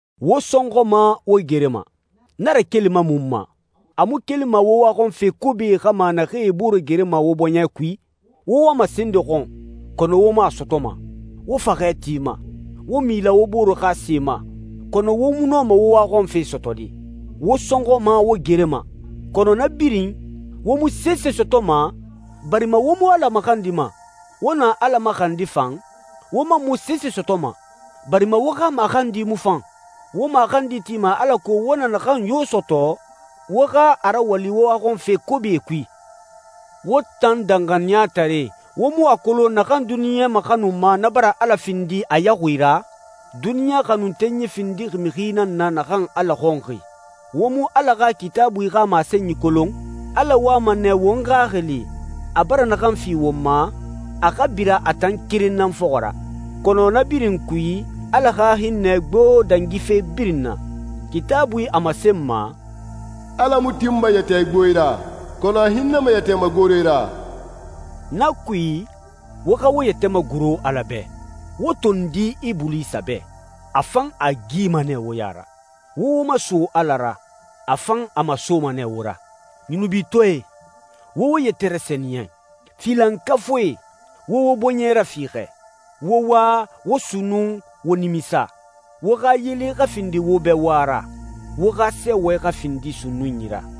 Wo sɔnxɔma, wo gerema. Na rakelima mun ma? A mu kelima wo waxɔnfe kobie xa ma naxee e boore gerema wo bɔɲɛ kui? Wo wama se nde xɔn, kɔnɔ wo mu a sɔtɔma. Wo faxɛ tima, wo mila wo boore xa se ma, kɔnɔ wo mu nɔma wo waxɔnfe sɔtɔde. Wo sɔnxɔma, wo gerema, kɔnɔ na birin, wo mu sese sɔtɔma barima wo mu Ala maxandima. Wo na Ala maxandi fan, wo man mu sese sɔtɔma, barima wo xa maxandi mu fan. Wo maxandi tima alako wo na naxan yo sɔtɔ wo xa a rawali wo waxɔnfe kobie kui. Wo tan danxaniyataree, wo mu a kolon naxan duniɲa maxanuma na bara Ala findi a yaxui ra? Duniɲa xanuntenyi findixi mixi nan na naxan Ala xɔnxi. Wo mu Ala xa Kitaabui xa masenyi kolon? Ala wama nɛ won xaxili, a bara naxan fi won ma, a xa bira a tan keren nan fɔxɔ ra. Kɔnɔ na birin kui, Ala xa hinnɛ gbo dangi fe birin na. Kitaabui a masenma, «Ala mu tinma yɛtɛ igboe ra, kɔnɔ a hinnɛma yɛtɛ magore ra.» Na kui, wo xa wo yɛtɛ magoro Ala bɛ. Wo tondi Ibulisa bɛ, a fan a gima nɛ wo ya ra. Wo wo maso Ala ra, a fan a masoma nɛ wo ra. Yunubitɔɛe, wo wo yɛtɛ rasɛniyɛn. Filankafuie, wo wo bɔɲɛ rafiixɛ. Wo wa, wo sunnun, wo nimisa. Wo xa yele xa findi wo bɛ wa ra, wo xa sɛɛwɛ xa findi sunnunyi ra.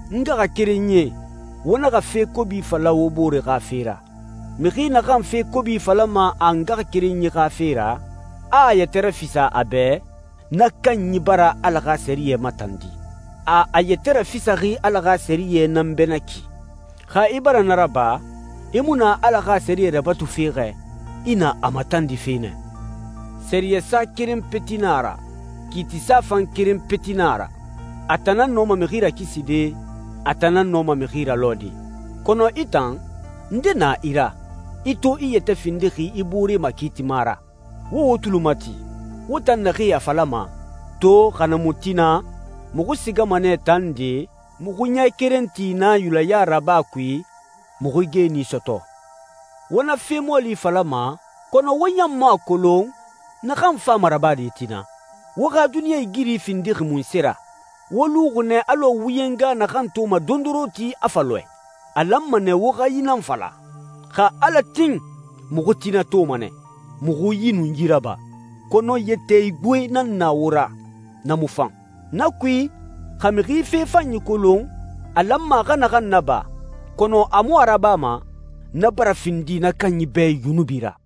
N ngaxakerenyie, wo naxa fe kobi fala wo bore xa fe ra. Mixi naxan fe kobi falama a ngaxakerenyi xa fe ra, a a yɛtɛ rafisa a bɛ, na kanyi bara Ala xa sɛriyɛ matandi. A a yɛtɛ rafisaxi Ala xa sɛriyɛ nan bɛ na ki. Xa i bara na raba, i mu na Ala xa sɛriyɛ rabatufe xɛ, i na a matandife nɛ. Sɛriyɛsa keren peti na a ra, kiitisa fan keren peti na a ra. A tan nan nɔma mixi rakiside, a tan nan nɔma mixi ralɔɛde. Kɔnɔ i tan, nde na i ra, i to i yɛtɛ findixi i boore makiitima ra? Wo wo tuli mati, wo tan naxee a falama, «To, xa na mu tina, muxu sigama nɛ taa nde, muxu ɲɛ keren ti na yulɛya raba kui, muxu geeni sɔtɔ.» Wo na fe mɔɔli falama kɔnɔ wo ɲan mu a kolon naxan fama rabade tina. Wo xa duniɲɛigiri findixi munse ra? Wo luxi nɛ alɔ wuyɛnga naxan toma dondoronti, a fa lɔɛ. A lanma nɛ wo xa yi nan fala, «Xa Ala tin, muxu tina toma nɛ, muxu yi nun yi raba.» Kɔnɔ yɛtɛ igboe nan na wo ra. Na mu fan. Na kui, xa mixi fe fanyi kolon a lanma a xa naxan naba kɔnɔ a mu a rabama, na bara findi na kanyi bɛ yunubi ra.